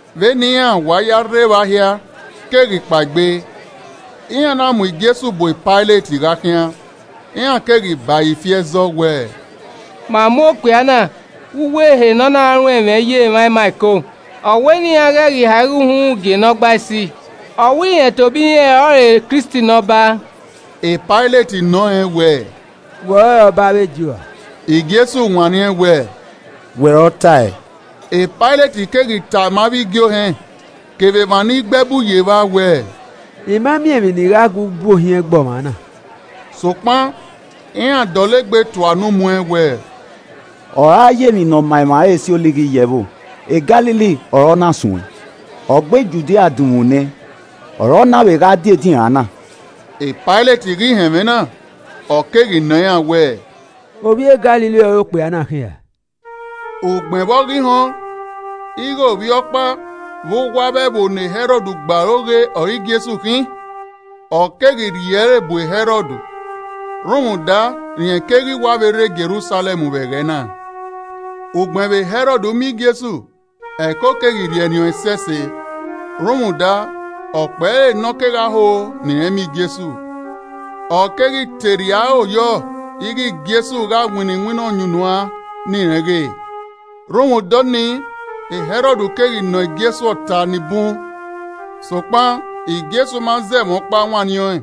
Vbene iran wa ya rre evba hia keghi kpaegbe, iran na mu Jesu bu Pailet gha khian. Iran keghi ba ẹre ifi ẹzọ wẹ, “Ma mu okpia na vbe uwu ehe ne ọ na ruẹn ẹmwẹ ye emwa ima ẹko, ọ wẹ ne iran ghẹ ghi ha igho uhunmwu gie Nọgbaisi, ọ wẹ rẹn tobọ irẹn ọrọre Kristi ne Ọba.” Pailet nọ rẹn wẹẹ, “Wẹ ọrọre ọba avbe Ju ra?” Jesu wanniẹn wẹẹ, “Wẹ ọre ọ tae.” Pailet keghi tama avbe igie ohẹn kevbe emwa ni gbe ẹbu ye evba wẹẹ, “I ma miẹn emwi ne I gha gu bu ohiẹn gbe ọmwa na.” Sokpan iran dọlegbe tua unu muẹn wẹẹ, “Ọ ra ya emwi ne ọ ma emwa re si olighi ye ẹvbo. Galili ọre ọ na suẹn, ọ gbe Judia dunmwu nẹ, ọre ọ na vbe gha die edinran na.” Pailet ghi họn ẹmwẹ na, ọ keghi nọ iran wẹẹ, “Ovbi e Galili ọre okpia na khin ra?” Ugbẹn vbe ọ ghi họn ighẹ ovbi ọkpa vbe uwu avbe ẹvbo ne Hẹrọd gbe aro ghe ọre Jesu khin, ọ keghi rhie ẹre bu Hẹrọd rhunmwuda rẹn keghi wa vbe rre Jerusalẹm vbe ẹghẹ na. Ugbẹn vbe Hẹrọd miẹn Jesu, ẹko keghi rhiẹnrhiẹn ọẹn ẹsẹse, rhunmwuda ọkpẹre ne ọ kegha ho ne iran miẹn Jesu. Ọ keghi te rhie aro yọ ighẹ Jesu gha winna iwinna ọyunnuan ne irẹn ghe. Rhunmwuda ọnii Hẹrọd keghi nọ Jesu ọta ni bun sokpan Jesu ma zẹ ẹmwẹ ọkpa wanniẹn ọẹn.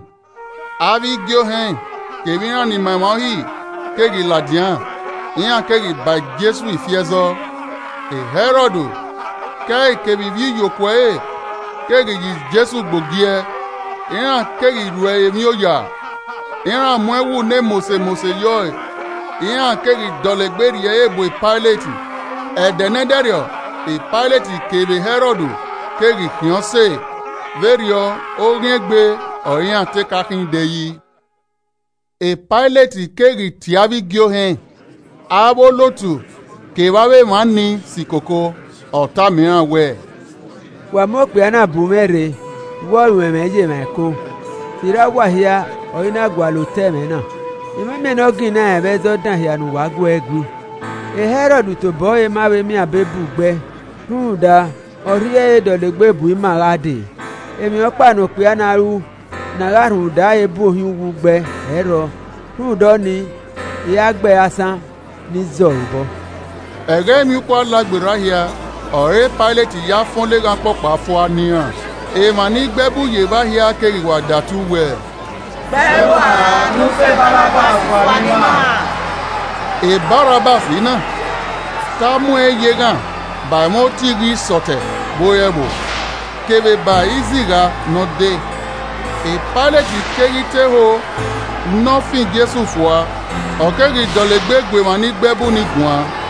Avbe igie ohẹn kevbe iran ni ma emwa Uhi keghi ladian, iran keghi ba Jesu ifi ẹzọ. Hẹrọd ke ẹe kevbe ivbiyokuo ẹre keghi ya Jesu gbe ogiẹ, iran keghi ru ẹre emwi oya. Iran mu ẹwu ne mose mose ye ọe, iran keghi dọlegbe rhie ẹre bu Pailet. Ẹdẹ ne ẹdẹrriọ Pailet kevbe Hẹrọd keghi khian ọse vberriọ oghian egbe ọre iran te ka khin de yi. Pailet keghi tie avbe igie ohẹn, avbe olotu kevbe avbe emwa ni si koko. Ọ tama iran wẹẹ, “Wa mu okpia na bu mwẹ rre wẹ ọ ruẹn ẹmwẹ ye emwa ẹko. Sirra uwa hia ọre I na gualọ otọ ẹmwẹ na, I ma miẹn ne ọ ginna ẹn vbe ẹzọ dan hia ne uwa gu ẹe gui. E Hẹrọd tobọ ẹre ma vbe miẹn abe bu gbe ẹe rhunmwuda, ọ rhie ẹre dọlegbe bu ima gha dee. Emwi ọkpa ne okpia na ru ne a gha rhunmwuda ẹre bu ohiẹn uwu gbe ẹe ẹ i rrọọ. Rhunmwuda ọnii, I ra gbe ẹre asan ne I zẹ ọre obọ.” [ Ẹghẹ emwiukpo Alagberra hia ọre Pailet ya fan oleghan ọkpọkpa fua ne iran.] Emwa ni gbe ẹbu ye evba hia keghi wa datu wẹẹ, “Gbe ẹe rua ne u fan Barabbas fua ne ima!” ( Barabbas na, te a muẹn ye eghan ba ẹmwẹ otighi isọtẹ vbe ore ẹvbo, kevbe ba izigha ne ọ de.) Pailet keghi te ho ne ọ fan Jesu fua, ọ keghi dọlegbe gu emwa ni gbe ẹbu ni guan.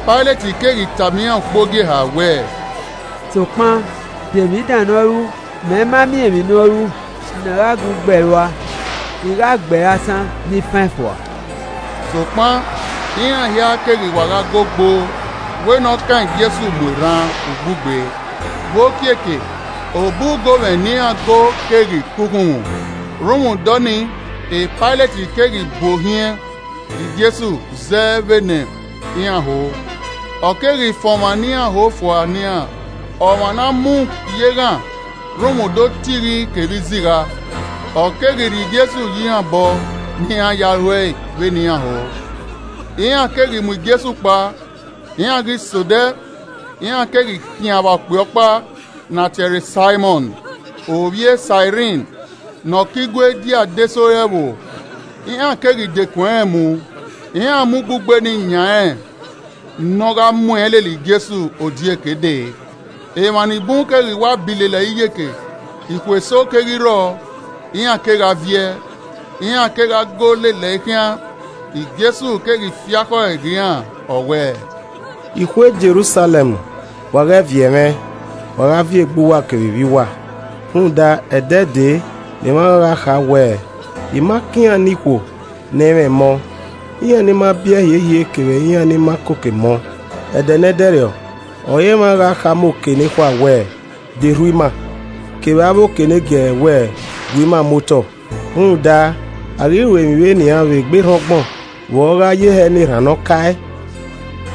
Pailet keghi tama iran ukpogieha wẹẹ, “Sokpan de emwi dan ne ọ ru? Mẹ ma miẹn emwi ne ọ ru ne a gha gu gbe ẹe rua. I gha gbe ẹre asan ne I fan ẹn fua.” Sokpan iran hia keghi wa gha go gboo wẹ ne ọ kan Jesu mu erhan ugbugbe. Vbe okiekie obọ ugomwẹ ne iran go keghi ke okhunmwu. Rhunmwuda ọnii Pailet keghi bu ohiẹn Jesu zẹ vbene iran ho. Ọ keghi fan ọmwa ne iran ho fua ne iran, ọmwa ne a mu ye eghan rhunmwuda otighi kevbe izigha, ọ keghi rhie Jesu ye iran obọ ne iran ya ruẹe vbene iran ho. Iran keghi mu Jesu kpao, iran ghi sẹ odẹ, iran keghi khian vba okpia ọkpa ne a tie ẹre Saimọn, ovbi e Sairin, ne ọ ke igue die adesẹ ore ẹvbo. Iran keghi dekun ẹnrẹn mu, iran mu ugbugbe nii yan rẹn ne ọ gha muẹn lele Jesu odieke dee. Emwa ni bun keghi wa bi lele ẹre iyeke, ikhuo eso keghi rrọọ, iran kegha viẹ, iran kegha go lele ẹe khian. Jesu keghi fi akhọe ghe iran, ọ wẹẹ, “Ikhuo Jerusalẹm! Wa ghẹ viẹ mwẹ, wa gha viẹ egbe uwa kevbe ivbi uwa. Rhunmwuda, ẹdẹ dee ne emwa gha kha wẹẹ, ‘I ma kan iran ne ikhuo ne ẹ i mwẹ emọ, iran ni ma biẹ hiehie kevbe iran ni ma koko emọ!’ Ẹdẹ ne ẹdẹrriọ ọre emwa gha khama oke nekhua wẹẹ, ‘De rhu ima!’ kevbe avbe oke negiẹrẹ wẹẹ, ‘Gue ima muotọ.’ Rhunmwuda a ghi ru emwi vbe nian vbe egbe erhan ọgbọn, vbe ọ gha ye hẹ ne erhan ne ọ kae?”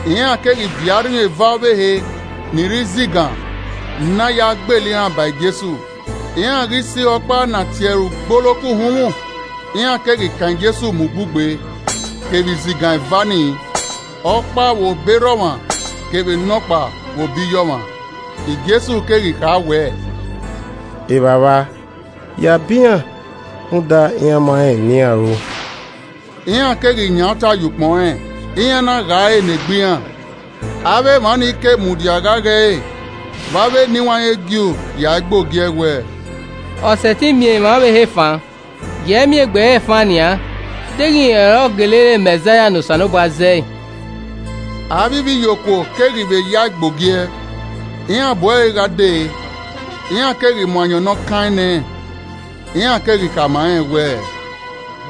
Iran keghi viọ arhin eva ọvbehe ni re izigan, ne a ya gbele iran ba Jesu. Iran ghi sẹ ihe ọkpa ne a tie ẹre “Ugboloko Uhunmwu,” iran keghi kan Jesu mu ugbugbe, kevbe izigan eva nii, ọkpa vbe obọ erha ọmwa kevbe nọkpa vbe obọ iye ọmwa. Jesu keghi kha wẹẹ, “Evbavba yabọ iran rhunmwuda iran ma rẹn emwi ne iran ru.” Iran keghi yan uta ye ukpọn rẹn, iran na gha ẹre ne egbe. Emwa mudia gha ghe ẹre vbe avbe eniwanrẹn e Ju yae gbe ogie wẹẹ, “Ọ sẹtin miẹn emwa ọvbehe fan, giee miẹn egbe ẹre fan nian deghẹ rẹn ọre ọ gele re Mẹzaia ne Osanobua zẹ!” Avbe ivbiyokuo keghi vbe yae gbe ogiẹ, iran bu ẹre gha dee, iran keghi mu ayọn ne ọ kaẹn nẹ. Iran keghi khama rẹn wẹẹ,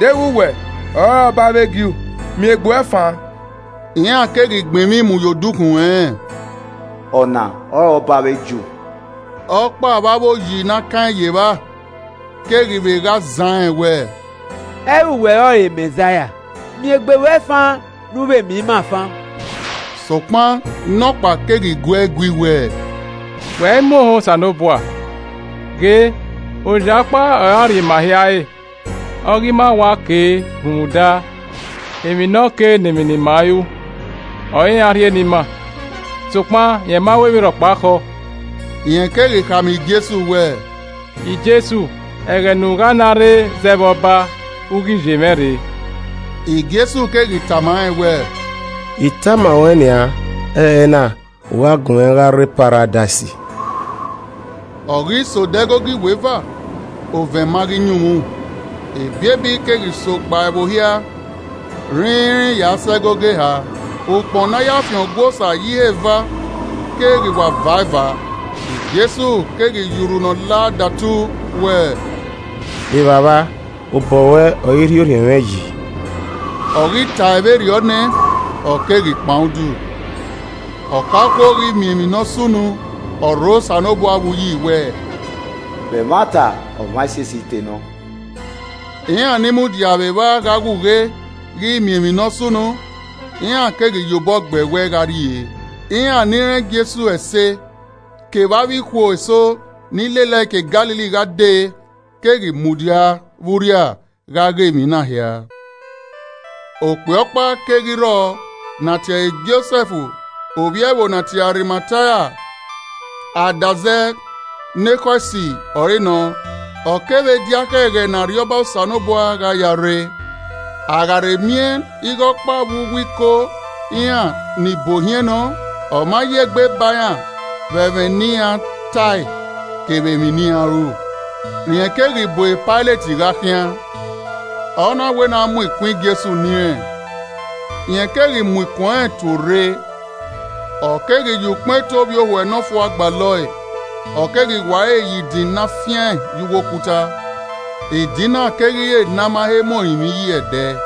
“Deghẹ wẹ ọrọre ọba avbe Ju miẹn egbe ruẹ fan!” Iran keghi gbẹn emwi mu ye odukhunmwu ẹnrẹn, “Ọna ọrọre Ọba avbe Ju.” Ọkpa vbe avbe oyi ne a kaẹn ye evba keghi vbe gha zan rẹn wẹẹ, “Ẹ i re uwẹ ọrọre Mẹzaia? Miẹn egbe ruẹ fan ne u vbe miẹn ima fan.” Sokpan nọkpa keghi guẹe gui wẹẹ, “Wẹ i mu ohan Osanobua? Ghe, oya ọkpa ọre a rri ima hia re. Ọ ghe ima wa kei rhunmwuda emwi ne ọ kei ne emwi ne ima ru ọre iran rhie ne ima, sokpan rẹn ma ru emwi rhọkpa khọọ.” Rẹn keghi khama Jesu wẹẹ, “Jesu, ẹghẹ ne u gha na rre zẹ vbe Ọba, u ghi ye mwẹ rre.” Jesu keghi tama rẹn wẹẹ, “I tama ruẹ nian, ẹrẹna, u gha gun mwẹ gha rre Paradais.” Ọ ghi sẹ odẹ ẹgogo iweva, ovẹn ma ghi yunmwu, ebiebi keghi so gba ẹvbo hia rhinrin ya sẹ ẹgogo eha. Ukpọn ne a ya fian Ọgua Osa ye ihe eva keghi wa va eva. Jesu keghi ya urhu ne ọ la datu wẹẹ, “Evbavba, obọ ruẹ ọre I rhie orhiọn mwẹ yi!” Ọ ghi tae vberriọ nẹ, ọ keghi kpan udu. Ọkaokuo ghi miẹn emwi ne ọ sunu, ọ rho Osanobua vbe uyi wẹẹ, “Vbe ẹmwata ọmwa esiesi te nọ.” Iran ni mudia vbe evba gha ghe ughe ghi miẹn emwi ne ọ sunu, iran keghi ye obọ gbe ẹwẹe gha rrie. Iran ni rẹn Jesu ẹse, kevbe avbe ikhuo eso ni lele ẹe ke Galili gha dee keghi mudia vbe urria gha ghe emwi na hia. Okpia ọkpa keghi rrọọ ne a tie ẹre Josẹf, ovbi ẹvbo ne a tie ẹre Arimatia adazẹ ne ekhọe esi ọre nọ, ọ kevbe, diakhẹ ẹghẹ ne Arriọba Osanobua gha ya rre. A gha rhe miẹn ighe ọkpa vbe uwu Iko iran ni bu ohiẹn nọ, ọma ye egbe ba iran vbe ẹmwẹ ne iran tae kevbe emwi ne iran ru. Rẹn keghi bu e Pailet gha khian, ọ na wẹ ne a mu ikun Jesu ne irẹn. Rẹn keghi mu ikun ẹnrẹn tuorre, ọ keghi ya ukpọn eto ovbiohuẹ nọfua gbalọ ẹe, ọ keghi wa ẹre ye idin ne a fian ye uwu okuta, idin na keghi re ne a ma he mu orinmwi yi ẹdẹ.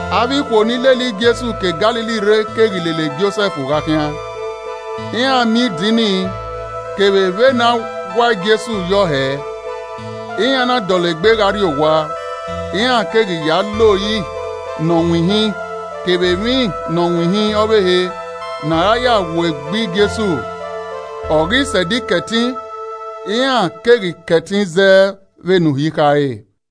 Avbe ikhuo ni lele Jesu ke Galili rre keghi lele Josẹf gha khian, iran miẹn idin nii kevbe vbene a wa Jesu yọ hẹẹ. Iran na dọlegbe gha rrie owa, iran keghi ya le ori ne ọ winhin kevbe emwi ne ọ winhin ọvbehe ne a ra ya wo egbe Jesu, ọ ghi sẹ Ẹdẹ Ikẹtin, iran keghi kẹtin zẹ vbe ne Uhi khare.